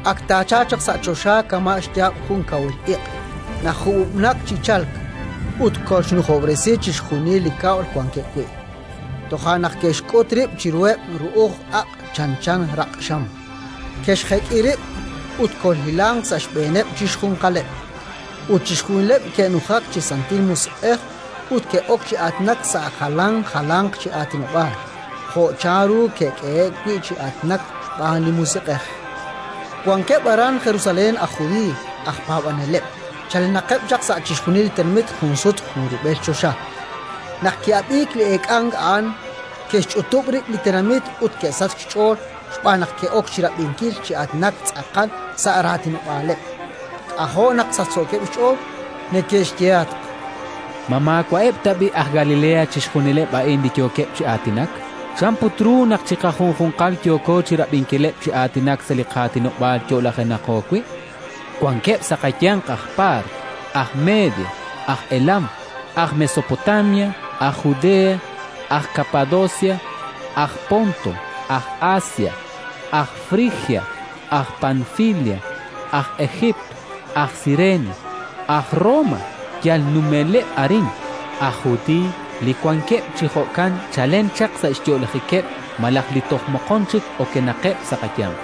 Ak taachalq chaq sa' choxa kama' xyaab' jun kawil iq' najub'ub'nak chi chalk, ut kolxnujob'resi chixjunil li kab'l wankeb' wi'. Toja' naq ke'xk'ut rib' chiruheb' ru'uj aq' chanchan raq'xam, ke'xjek'i rib' ut kolhilanq sa' xb'eeneb' chi xjunjunqaleb'. Ut chixjunileb' ke'nujak chi Santil Musiq'ej ut ke'ok chi aatinak sa' jalan jalanq chi aatinob'aal, jo' chanru ke'k'ehe'k wi' chi aatinak xb'aan li Musiq'ej. Wankeb' aran Jerusalén aj Judiiy aj paab'aneleb', chalenaqeb' chaq sa' chixjunileb' li tenamit junsut junrub'el choxa. Naq ki'ab'iik li eek'ank a'an, ke'xch'utub' rib' li tenamit ut ke'sachk xch'ool xb'aan naq ke'ok chi rab'inkil chi aatinak tz'aqal sa' raatinob'aaleb'. K'ajo' naq sachsookeb' xch'ool. Neke'xyehatq: —Ma maawa'eb' tab'i' aj Galilea chixjunileb' a'in li yookeb' chi aatinak? Chan put ru naq chiqajunjunqal yooko chi rab'inkileb' chi aatinak sa' li qaatinob'aal yo'lajenaqo wi'? Wankeb' sa' qayanq aj Paart, aj Media, aj Elam, aj Mesopotamia, aj Judea, aj Kapadocia, aj Ponto, aj Asia, aj Frigia, aj Panfilia, aj Ejiipt, aj Sirenaika, aj Roma yal numeleb' arin, aj Judiiy li wankeb' chi jo'kan chalen chaq sa' xyo'lajikeb' malaj li toj moqon chik okenaqeb' sa' qayanq.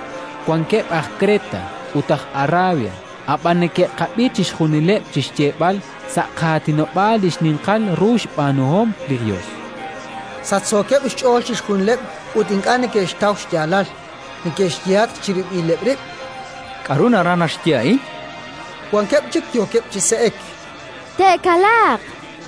Wankeb' aj Kreta ut aj Arabia, ab'an neke'qab'i chixjunileb' chi xyeeb'al sa' qaatinob'aal li xninqal ru xb'aanuhom li Yos! Sachsookeb' xch'ool chixjunileb' ut ink'a' neke'xtaw xyaalal; neke'xyehatq chirib'ileb' rib': —K'aru naraj naxye a'in? Wankeb' chik yookeb' chi se'ek: —Te'kalaaq, chankeb'.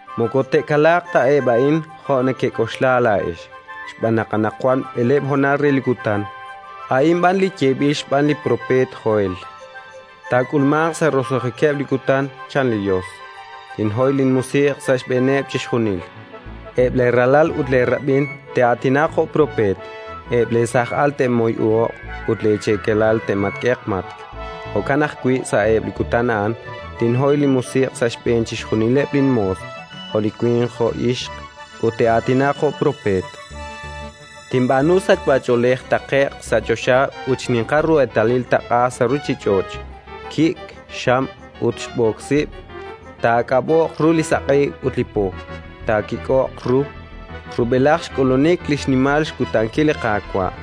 Moko te'kalaaq ta eb' a'in jo' nekek'oxla laa'ex, xb'aan naq anaqwan b'eleeb' honal re li kutan; a'in b'an li yeeb'il xb'aan li propeet Joel: «Taak'ulmanq sa' roso'jikeb' li kutan, chan li Yos: Tinhoy linMusiq' sa' xb'eeneb' chixjunil. Eb' leeralal ut leerab'in te'aatinaq jo' propeet; eb' leesaaj al te'moyuhoq ut leecheekelal te'matk'eq matk'. Jo'kan ajwi', sa'eb' li kutan a'an, tinhoy linMusiq' sa' xb'een chixjunileb' linmoos, jo' winq jo' ixq, ut te'aatinaq jo' propeet. Tinb'aanu sachb'ach'oolej taqe'q sa' choxa ut xninqal ru eetalil taq'a sa' ruuchich'och': kik', xam ut xb'ook sib'. Taa'aak'ab'o'q ru li saq'e ut li po taakik'o'q ru, rub'elaj xk'ulunik li xnimal xkutankil li Qaawa'.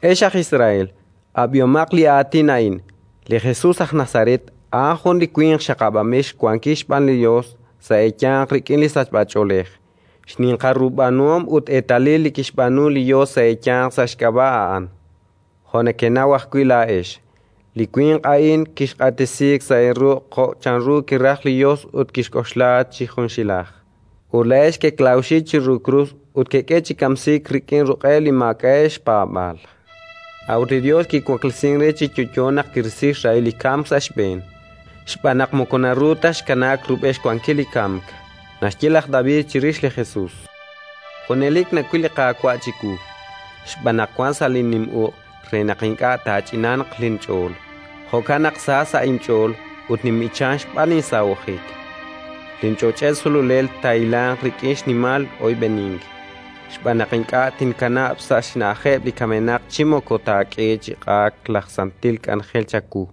“Ex aj Israel, ab'ihomaq li aatin a'in: Li Jesus aj Nazaret a'an jun li winq xaqab'anb'il xwankil xb'aan li Yos sa' eeyanq rik'in sachb'ach'oolej, xninqal ru b'aanuhom ut eetalil li kixb'aanu li Yos sa' eeyanq sa' xk'ab'a' a'an, jo' nekenaw ajwi' laa'ex. Li winq a'in kiq'axtesiik sa' eeruq' jo' chanru kiraj li Yos ut kixk'oxla chi junxilaj, ut laa'ex keklawxi chiru krus ut kek'e chi kamsiik rik'in ruq'eb' li maak'a'eb' xpaab'aal. A'ut li Yos kiwaklesink re chi yo'yo naq kirisi xrahil li kamk sa' xb'een, xb'aan naq moko naru ta xkanaak rub'el xwankil li kamk. Naxye laj David chirix li Jesus: «Junelik nawil li Qaawa' chiwu, xb'aan naq wank sa' linnim uq' re naq ink'a' taach'inanq linch'ool. Jo'kan naq sa sa' inch'ool ut ninb'ichank xb'aan linsahojik; linch'och'el sululel taahilanq rik'in xnimal oyb'enink, xb'aan naq ink'a' tinaakanab' sa' xna'ajeb' li kamenaq chi moko taak'e chi q'aak laj santil k'anjel chawu.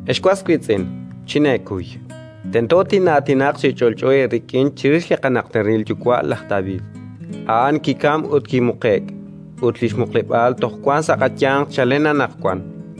“Ex was wiitz'in, chineekuy; tento tin'aatinaq chi ch'olch'o eerik'in chirix li qanajteril yuwa' laj David: a'an kikamk ut kimuqe'k, ut li xmuqleb'aal toj wank sa' qayanq chalen anaqwan.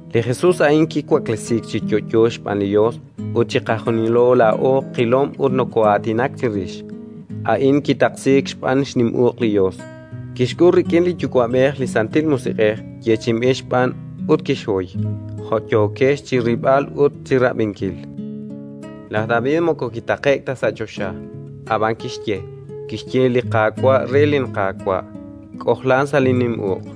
Li Jesus a'in kiwaklesiik chi yo'yo xb'aan li Yos ut chiqajunilo laa'o qilom ut nokoo'aatinak chirix. A'in kitaqsiik xb'aan xnim uq' li Yos, kixk'ul rik'in li Yuwa'b'ej li Santil Musiq'ej yeechi'inb'il xb'aan ut kixhoy, jo' yookex chi rilb'al ut chi rab'inkil. Laj David moko kitaqe'k ta sa' choxa, ab'anan kixye: «Kixye li Qaawa' re linQaawa': K'ojlan sa' linnim uq'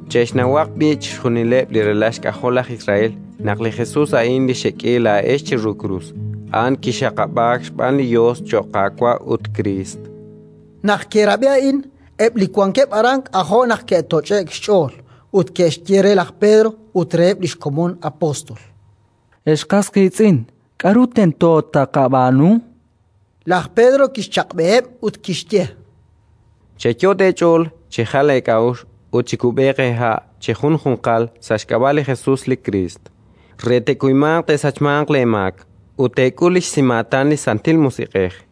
“Che'xnawaq b'i' chixjunileb' li ralal xk'ajol laj Israel naq li Jesus a'in li xek'e laa'ex chiru krus, a'an kixaqab'aak xb'aan li Yos cho'q Qaawa' ut Kriist”. Naq ke'rab'i a'in, eb' li wankeb' aran k'ajo' naq ke'toch'e'k xch'ool, ut ke'xye re laj Pedro ut reheb' li xkomon apóstol: —Ex qas qiitz'in, k'aru tento taaqab'aanu? Laj Pedro kixchaq'b'eheb' ut kixye: —Cheyot' eech'ool chejal eek'a'uxl ut chikub'eeq eeha' chejunjunqal sa' xk'ab'a' li Jesus li Kriist, re te'kuymanq te'sachmanq leemaak; ut teek'ul li xsimaatan li Santil Musiq'ej.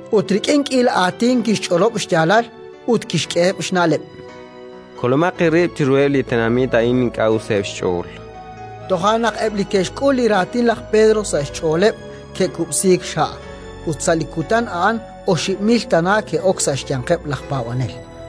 Ut rik'in k'iila aatin kixch'olob' xyaalal ut kixk'eheb' xna'leb': —Kolomaq eerib' chiruheb' li tenamit a'in ink'a' useb' xch'ool, chan. Toja' naq eb' li ke'xk'ul li raatin laj Pedro sa' xch'ooleb' ke'kub'siik xha', ut sa' li kutan a'an oxib' mil tana ke'ok sa' xyanqeb' laj paab'anel.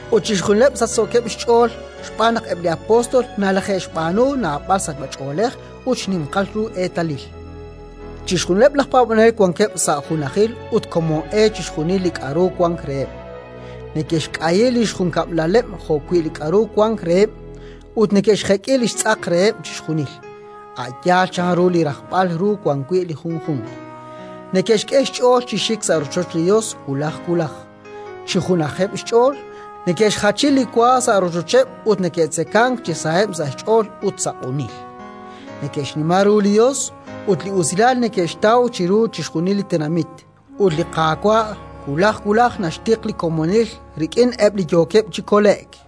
Ut chixjunileb' sachsookeb' xch'ool xb'aan naq eb' li apóstol nalaje'xb'aanu naab'al sachb'ach'oolej ut xninqal ru eetalil. Chixjunileb' laj paab'anel wankeb' sa' junajil ut komon e chixjunil li k'aru wank reheb'. Neke'xk'ayi li xjunkab'laleb' jo'wi' li k'aru wank reheb', ut neke'xjek'i li xtz'aq reheb' chixjunil, a' yaal chanru li rajb'al ru wan wi' li junjunq. Neke'xk'e xch'ool chi xik sa' rochoch li Yos wulaj wulaj, chi junajeb' xch'ool; neke'xjachi li wa sa' rochocheb' ut neke'tzekank chi saheb' sa' xch'ool ut sa' q'unil. Neke'xnima ru li Yos, ut usilal neke'xtaw chiru chixjunil li tenamit. Ut li Qaawa' wulaj wulaj naxtiq li komonil rik'in eb' li yookeb' chi kole'k.